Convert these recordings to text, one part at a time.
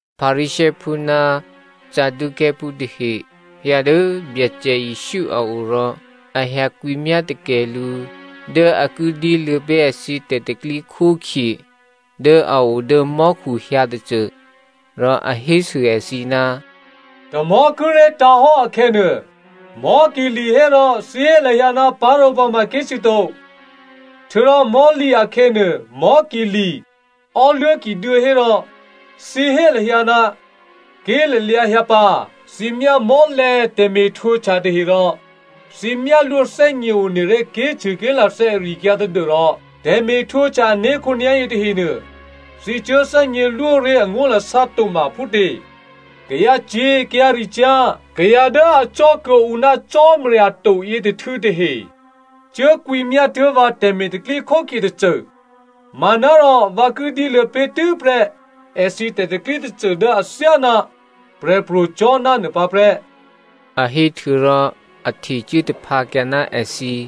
Pharisěophú ná Saducěophú tahe hyǎ dố Byacè Jesǔ a o rò a hyǎ kwǐmyá takè lǔ dố a ki dyéluô̌ pé̤ èthǐ tè̤pro̤tè̤prya̤ dố a o dố mò́khu hyǎ tôcô. Rò a hésû èthǐ, “Tamò̤́ kíré̤ tǎ̤hò́ akhè̌nuô, mò́ ki li̤ hérò thǐ hé lahyǎ, parǒpǎ ma ké̤cṳ̂ to. Htuô̌rò mò̤́lǐ akhè̌nuô, mò́ ki li̤, ò́luố̤ ki duô̌ hò́rò thǐ hé lahyǎ, ké̤lalyǎ hyǎ pǎ. Thǐ myá mò́lè̤̌ tè̤me̤htwǒhtya tahe rò thǐ myálwó thè́gněone ré̤ ké̤cṳ̂ ké̤lathè́ ari-akyǎ tadû́rò tè̤me̤htwǒhtya ané̤ khǒnyá̤yě tahenuô thǐ cuố thè́gně lwó ré̤ angó̤lasá to ma phútě? Kayǎcyě̤ kayǎricyá̤ kayǎ dố acò́ kuô̌ǔ ná Cò́marya to yětôhtû̌ tahe cuốkwǐmyá tuố̤ vǎ tè̤me̤ tè̤pro̤tè̤prya̤ tôcô, manárò vǎ ki dyéluô̌ pé̤tû́prè́ èthǐ tè̤pro̤tè̤prya̤ tôcô dố athyáná Prè̤pro̤ Jona nuô pǎ prè́,” a héhtuô̌rò a htecuố taphǎkyǎ ná èthǐ.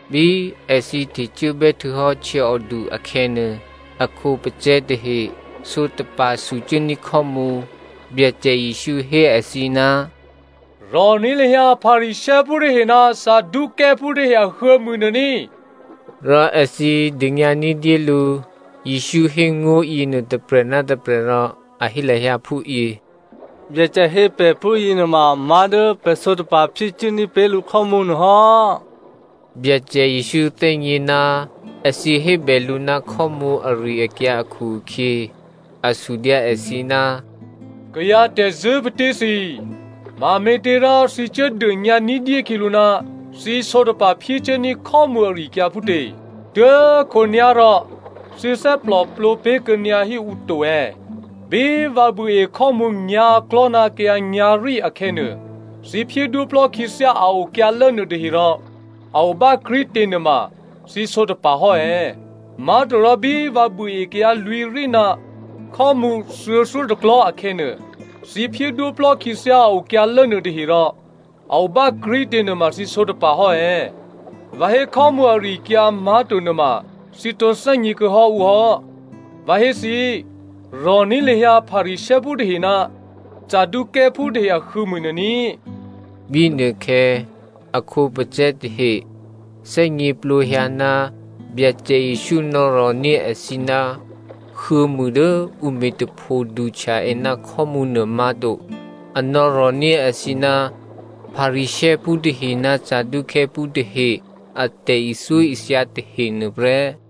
Bí èthǐ htecuốbè́ htuô̌hò́ htyěòdu akhè̌nuô, a khǒpacè̤̌ tahe sǒtapa̤ sucuốní̤ khò́mǔ. Byacè Jesǔ hé èthǐ, “Rò̤ní̤ lahyǎ Pharisěophú tahe ná Saducěophú tahe ahuô̌mû nuô ní꤮.” Rò èthǐ dônyǎ ní̤dyé lǔ Jesǔ hé ngó̤ yěnuô tôprè̤ ná tôprè̤ rò a hé lahyǎ phúyě, “Byacè hé pè̤ phúyěnuôma má̤dố pè̤ sǒtapa̤ phyécuốní̤ pé̤ lǔ khò́mǔnuô hò́.” Byacè Jesǔ thè́gně ná èthǐ hébè lǔ ná khò́mǔ ari-akyǎ akhu-akhyě, a sudyǎ èthǐ, “Kayǎ tè̤zṳ̂́ patí thǐ꤮, mame̤těrò thǐ cuốdônyǎ ní̤dyé khyělǔ ná thǐ sǒtapa̤ phyécuốní̤ khò́mǔ ari-akyǎ phútě? Tuố̤khǒnyá̤rò thǐ thè́gněplǒ pé̤ kuô̌nyǎ híǔ to è̌? Bí vǎ buôe khò́mǔ nyǎ̤klò̤́ ná kayǎ nyǎ̤rí akhè̌nuô, thǐ phyédwóplò́ khyěthyá a okyǎlố nuôtaherò a o bákrí̤tě nuôma thǐ sǒtapa̤hò́ è̌? Má̤torò bí vǎ buôe kayǎ lwǐ̤rí ná khò́mǔ thuô̌thyótôklò̤́ akhè̌nuô, thǐ phyédwóplò́ khyěthyá a okyǎlố nuôtaherò a o bákrí̤tě nuôma thǐ sǒtapa̤ hò́ è̌? Vǎ hé khò́mǔ ari-akyǎ má̤to nuôma thǐ tǒ thè́gně kuô̌hò́ ǔ hò́. Vǎ hé thǐ, rò̤ní̤ lahyǎ Pharisěophú tahe ná Saducěophú tahe ahuô̌mû nuô ní꤮.” Bínuôkhè̌ a khǒpacè̤̌ tahe thè́gněplǒhyǎ ná Byacè Jesǔ nò̌rò̤ní̤ èthǐ ná huô̌mû dố ǔ me̤ tapho duhtya è ná khò́mǔ nuô má̤to. A nò̌rò̤ní̤ èthǐ ná Pharisěophú tahe ná Saducěophú tahe a tè̤ithyóithya tahe nuôprè́.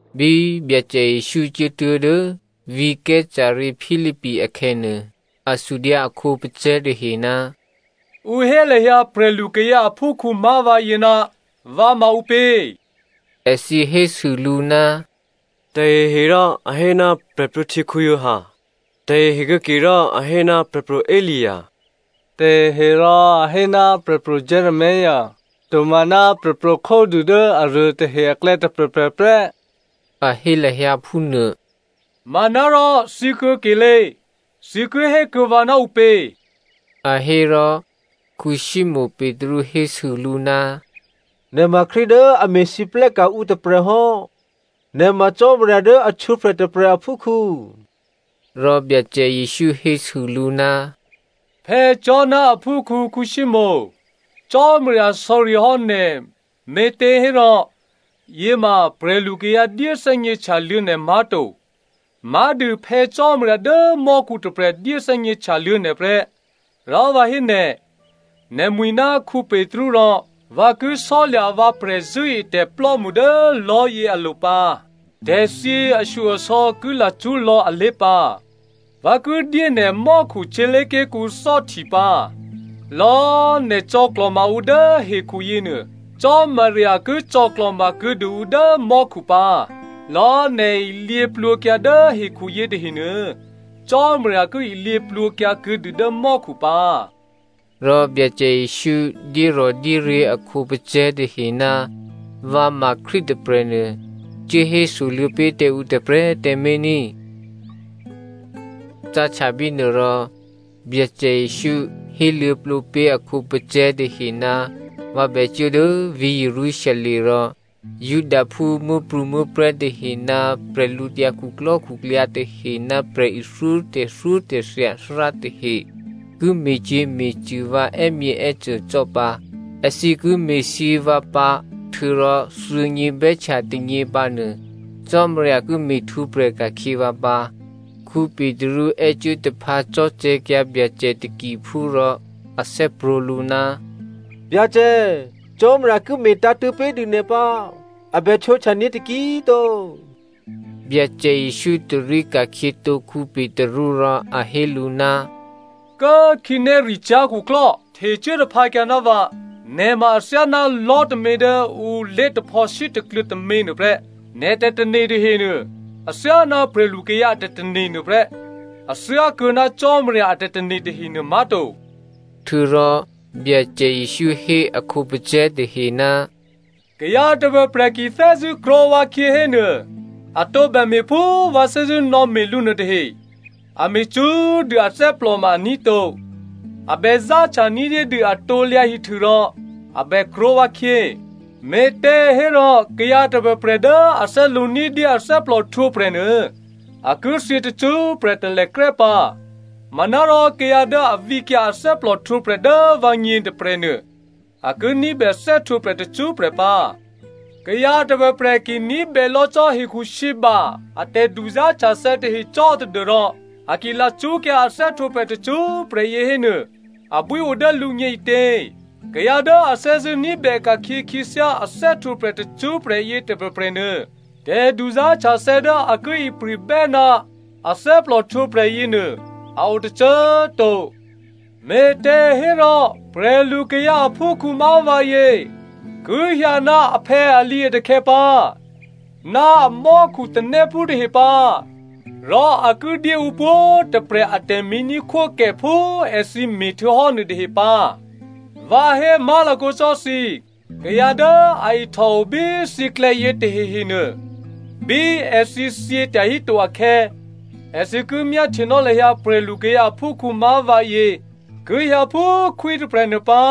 Bí Byacè Jesǔ cuốtuố̤ dố vǐ̤ Caesarea Philipi akhè̌nuô, a sudyǎ a khǒpacè̤̌ tahe, “Ǔ hé lahyǎ prè̤lukayǎ aphúkhǔ má̤ vǎyě ná vǎ ma ǔpě?” Èthǐ hésû lǔ, “Taheherò a hé ná Giovanni Baptista, tahehe kuô̌kerò a hé ná Prè̤pro̤ Elia, taheherò a hé ná Prè̤pro̤ Jeremia, tomaná prè̤pro̤ khódû dố aruô tahe aklè̌ tôprè̤prè̤ prè́,” a hé lahyǎ phúnuô. “Manárò, thǐ kuô̌kelé꤮, thǐ ki hé kuô̌ vǎ ná ǔpě?” A hé rò, Simonè Petru hésû lǔ, “Nè̤ ma Krístu dố a me̤lwóhteka̤ ǔ tôprè̤ hò́. Nè̤ ma Cò́marya dố a htwǒprè̤ tôprè̤ aphúkhǔ.” Rò Byacè Jesǔ hésû lǔ, “Jona aphúkhǔ Simonè, Cò́marya sò̌ri hò́ nè̤ me̤těhérò yěma prè̤lu kayǎ dyéthè́gně htyaluô̌ nè̤ má̤to, má̤dû Phè̌ Cò́marya dố mò́khu tôprè̤ dyéthè́gně htyaluô̌ nè̤ prè́. Rò vǎ hé nè̤, nè̤mwi̤ ná Petru rò vǎ ki sò́lya̤ vǎ prè̤zṳ̂́etè̤plò́mṳ dố lò̤́yě alo̤ pǎ. Tè̤thyě ashyo-asò̌ ki lacṳ́ lò̌ alé̤ pǎ. Vǎ ki dyé nè̤ mò́khu htyělé̤ké̤kǔ thò́hti pǎ. Lò̌꤮ nè̤ cò̌klò̤ma ǔ dố hekhu yěnuô, Cò́marya ki cò̌klò̤ma kuô̌dû ǔ dố mò́khu pǎ. Lò̌꤮ nè̤ ilyě plwǒkyǎ dố hekhu yětahenuô Cò́marya ki ilyě plwǒkyǎ kuô̌dû dố mò́khu pǎ.” Rò Byacè Jesǔ dyérò̤dyéryě̤ a khǒpacè̤̌ tahe, vǎ ma Krístu tôprè̤nuô cuốhésoluô̌ pé̤ tǎ ǔ tôprè̤꤮ tǎmé̤ ní꤮. Cáhtya bínuô rò Byacè Jesǔ héluô̌plǒ pé̤ a khǒpacè̤̌ tahe ná vǎ bècuố dố vǐ̤ Jerusalem rò Judaphú muố̤prû̌muố̤prè̤́ tahe ná bwídukhu tahe ná prè̤ithyó tè̤thyótè̤thya athárá tahe ki me̤cyě̤me̤cṳ̂ vǎ è́myěè́cô cò́ pǎ. Èthǐ ki me̤thyě vǎ pǎ htuô̌rò thuô̌nyě bè́htya tônyěpǎ nuô Cò́marya ki me̤htwǒprè̤ ka̤khyě vǎ pǎ. Petru è́cuố taphǎ cò̤́cè̤̌kyǎ Byacè takiphú rò a thè́prwǒ̤ lǔ, “Byacè Cò́marya ki me̤tǎ̤tṳ̂̌ pé̤dû nè̤ pǎ. A bè htwǒhtyaní̤ taki꤮ to.” Byacè Jesǔ tarí ka̤khyětǒ Petru rò a hé lǔ, “Kố꤮ khǐnéricyá̤ khuklò́, htecuố taphǎkyǎ ná vǎ, nè̤ ma athyáná lò̤́ tômě dố ǔ lé̤taphò̌ sítakluô̌ tômě nuôprè́. Nè̤ tè̤tane̤ tahenuô athyáná prè̤lukayǎ a tè̤tane̤ nuô prè́, a thyákuô̌ ná Cò́marya a tè̤tane̤ tahenuô má̤to.” Htuô̌rò Byacè Jesǔ hé a khǒpacè̤̌ tahe, “Kayǎ tôprè̤prè̤ ki thè́zṳ̂́ krwǒ vǎkhyě hénuô, a tǒbè me̤ phú vǎ thè́zṳ̂́nò̌me̤ lǔ nuôtahe, a me̤ cṳ́꤮ dû athè́plò ma aní̤ to. A bè záhtya ní̤dyédû a krusu rò a bè krwǒ vǎkhyě. Me̤těhérò kayǎ tôprè̤prè̤ dố a thè́lǒ ní̤dyé athè́plò htwǒprè̤ nuô, a ki thyě tacṳ́prè̤ talèkrè́ pǎ. Manárò kayǎ dố a vǐkyǎ athè́plò htwǒprè̤ dố vǎgně tôprè̤nuô a ki ní̤bè thè́htwǒprè̤ tacṳ́prè̤ pǎ. Kayǎ tôprè̤prè̤ ki ní̤bè lò̌ cò́ hekhusǐba a tè̤duzá̤htyathè̌ tahe cò́ tadû́rò a ki lacṳ́kyǎ a thè́htwǒprè̤ tacṳ́prè̤ yě hénuô abwío dố lǔgně ǐtě? Kayǎ dố a thè́zṳ̂́ ní̤bè ka̤khyě khyěthyá a thè́htwǒprè̤ tacṳ́prè̤ yě tôprè̤prè̤nuô tè̤duzá̤htyathè̌ dố a ki ipri̤bè́ ná a thè́plòhtwǒprè̤ yěnuô a o tôcô꤮ to. Me̤těhérò prè̤lukayǎ aphúkhǔ má̤ vǎyě ki hyǎ ná aphè̌ alǐatakhè̌ pǎ, ná amò́khu tanéphú tahe pǎ rò a ki dyé ǔ pwǒ̤꤮ tôprè̤ a tè̤me̤ní̤khwókè phú èthǐ me̤htuô̌hò́ nuôtahe pǎ. Vǎ hé má̤lakǒ cò́ thǐ, kayǎ dố a ihtòo bí thǐklè̌yě tahehenuô, bí èthǐ thyětyahí to akhè̌, èthǐ ki myáhtyenò́ lahyǎ prè̤lukayǎ aphúkhǔ má̤ vǎyě ki hyǎ phú khwí tôprè̤nuô pǎ.”